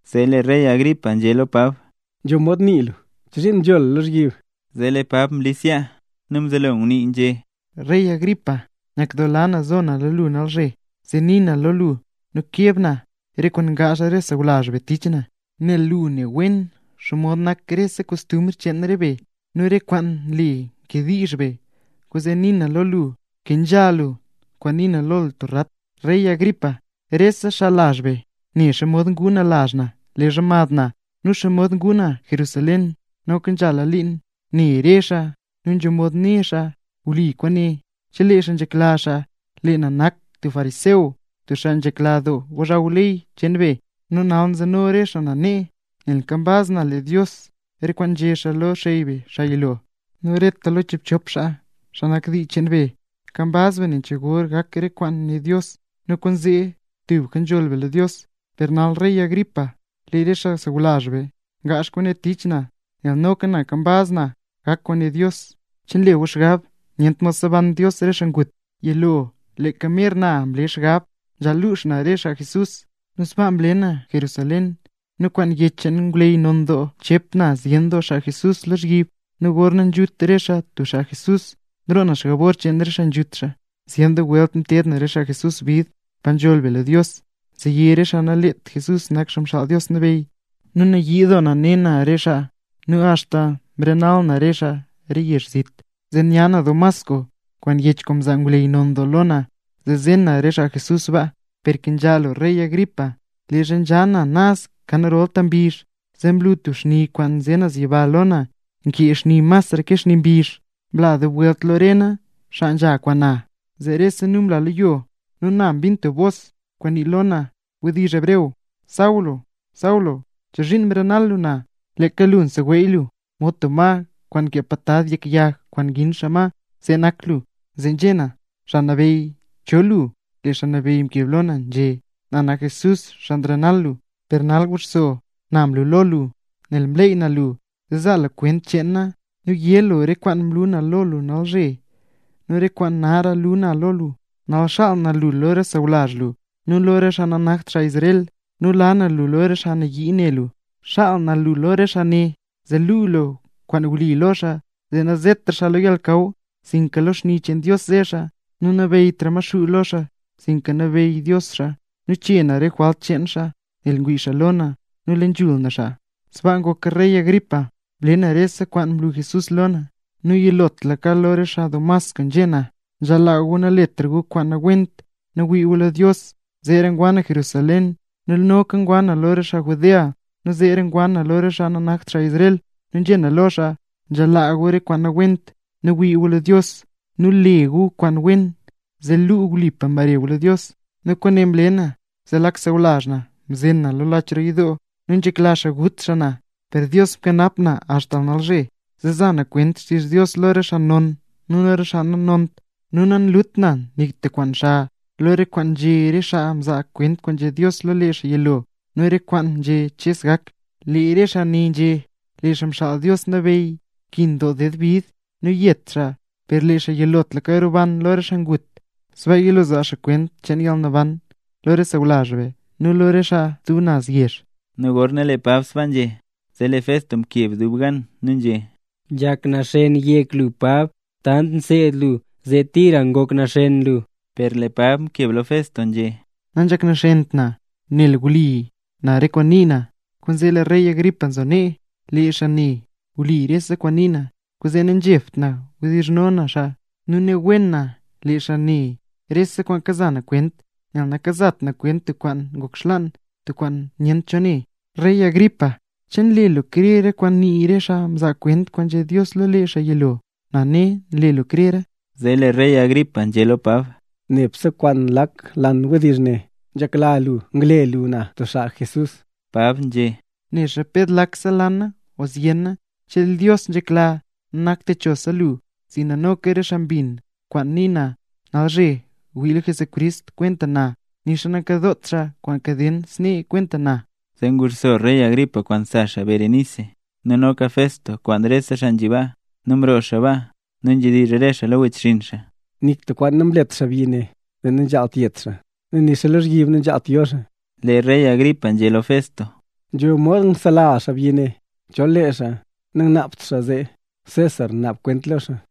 Zee lee rey Agripa nzhé lo Pab: —Nzho mod nii lu. ¿Chozhiin nzho lu lozhyib? Zee lee Pab mlis yaa nu mzelo ngunii nzhé: —Rey Agripa. Nyakdoola na nzo na lo lu nalzhe, zee nii na lo lu nu keb na re kwaan ngaazh re xaa sawlazh be tich na. Nel lu ne wen xomod nak rese kostumbr cheen re be, nu re kwaan nle nkediizh be. Kwaanzee nii na lo lu kenzha lu kwaan nii na lo lu tub rat. ’Rey Agripa, rese xaa lazh be ne xomod nguu na lazh na leezha mad na, nu xomod nguu na Jerusalén. Noka nzhala liin ne re xaa, nu nzho mod né xaa wli kwaane chelee xaa nzhekla xaa, lee na nak tub fariseo, tub xaa nzhekla doo gozhaw ley cheen be. Nu nal nzeno re xaa na nee, nel nkambaz na le Dios re kwaan nzhé Dios lo re xey be, xaa yilo. Nu reta lo chiibchop xaa, xaa nak dii cheen be, nkambaz be nen cho gor gak re kwaan nguné Dios, nu kwaanzee tubka nzholl be lo Dios. ¡Per nal rey Agripa, lee re xaa sawlazh be ngaazh kwaane tich na nel noka na nkambaz na gak kwaan nguné Dios! ¿Che nle gu xgab nyent mod seban Dios re xaa ngut? ’Yilo leeka mer na mle xgab nzhaal luux na re xaa Jesús, nu sbaa mle na Jerusalén. Nu kwaan yech kwaan mzaa ngwleyy non doo, mchep na zyen doo xaa Jesús lozhyib, nu gorna nzhut re xaa tub xaa Jesús, nroo na jabor cheen re xaa nzhut xaa. Zyen doo welt mteed na re xaa Jesús bid pa nzhool be lo Dios, zee yé re xaa naleet Jesús nak Xaa Mxaal Dios Nabeyy. Nu nayii doo na ne na re xaa, nu axta noka mrenal na re xaa re yezh zit. ’Zee nya na Damasco kwaan yech kwaan mzaa re ngwleyy non lo na, zee zen na re xaa Jesús baa. Per rey Agripa, nkenzha lu, leezha nzha na naz kan rolta mbizh, zee mlu tub xni kwaan nze naz yiba lo na, nkee masra xni ke xni mbizh. Mla dub welt lo re na xaa kwaan nzha kwaan na. Zee rese nu mla lo yo, nu na mbin tub bos kwaan ngunii lo na wdizh hebreo: “Saulo, Saulo, ¿chozhiin nrenal lu na? Leeka lu kaseweey lu, mod tub ma kwaan nkee patad yek yag kwaan ngin xaa ma. See nak lu.” Zee nzhé na: “Xaa Nabeyy, ¿cho lu?” Lee Xaa Nabeyy mkeb lo na nzhé: “Na nak Jesús, xaa karenal lu. Per nal guxso. Na mlu lo lu nel mleey na lu, zee zaa lu kwent cheen na, nu yé lu re kwaan mlu lo lu nalzhe, nu re kwaan nara lu na lo lu. Nal xaal na lu lo re xaa sawlazh lu nu lo re xaa nanakt xaa Israel, nu la na lu lo re xaa nayii ne lu. Xaal na lu lo re xaa ne, zee luu lu kwaan wli lo xaa, zee nazetra xaa lo yalnakaw sinka lo xni cheen Dios ze xaa; nu nanabeyytra Maxuu lo xaa sinka nabeyy Dios lo xaa, zee chee na re jwalt cheen xaa nel ngwii xaa lo na nu le nzhul na xaa.” ’Sbaa ngoka rey Agripa, mle na rese kwaan mlu Jesús lo na. Nu yilotlaka lo re xaa Damasco nzhé na: “Nzhaal laa gu naletra gu kwaan nawent nu wii gu lo Dios”. Zeera ngwa na Jerusalén nu noka ngwa na lo re xaa Judea, nu zeera ngwa na lo re xaa nanakt xaa Israel. Nu nzhé na lo xaa: “Nzhaal laa gu re kwaan nawent nu wii gu lo Dios, nu le gu kwaan wen, zee luu wlipa mbare gu lo Dios”. Nu kwaane mle na zee lee lak xaa sawlazh na mzen na lach roo yidoo nu nzhekla xaa ngut xaa na. Per Dios nkanap na axta nalzhe, zee nza na kwent xtizh Dios lo re xaa non nu lo re xaa nanont. Nu nanlut na nik tub kwaan xa lo re kwaan nzhé re xaa mzaa kwent kwaan nzhé Dios lo lee xaa yilo nu re kwaan nzhé Ches gak. Lee re xaa ne nzhé: “Lee Xaa Xaal Dios Nabeyy nkin ded doo bid nu yet xaa; per lee xaa yilotlaka roban lo re xaa ngut, sbaa yilo xaa zaa kwent cheen yalnaban lo re xaa sawlazh be nu lo re xaa re stub naz yezh”. Nu gorna lee Pab sbaa nzhé, zee lee Festo mkeb dub gan nu nzhé: —¡Nzhak naxen yek lu Pab! Tant nseed lu zee tira ngok naxen lu. Per lee Pab mkeb lo Festo nzhé: —Nanzhak naxent na; nel wli na re kwaan nii na. Kwaanzee lee rey Agripa nzo nee, lee xaa ne wli rese kwaan nii na, kwaanzee nanzhebt na kawdizhno na xaa. Nu ne wen na lee xaa ne rese kwaan kaza na kwent, nel nakazat na kwent tub kwaan ngok xlaan, tub kwaan nyent cho xaa ne. Rey Agripa, ¿che nle lu krer re kwaan ngunii re xaa mzaa kwent kwaan nzhé Dios lo lee xaa yilo? Na ne nle lu krera. Zee lee rey Agripa nzhé lo Pab: —Nebse kwaan lak lan wdizh ne nzhekla lu ngle lu na tub xaa Jesús. Pab nzhé: —Nexa ped lakse lana o zyena, chelee Dios nzhekla nanakta techosa lu sinka noka re xaa mbin kwaan ngunii na nalzhe wii lo Jesucrist kwenta na, nixa nakadoot xaa kwaan kaden snee kwenta na. Zee nguxso rey Agripa kwaan sa xaa Berenice, nu noka Festo, kwaan rese xaa nzhi baa. Nu mroo xaa baa nu nzhedizh re xaa lo wechxinn xaa: —Nik tub kwaan namlet xaabyi ne zee nzhaal yet xaa, nu nixa lozhyib nanzhaalt yo xaa. Lee rey Agripa nzhé lo Festo: —Nzho mod ngzela lu xaabyi ne, chol lee xaa nangnaabt xaa zee César naab kwent lo xaa.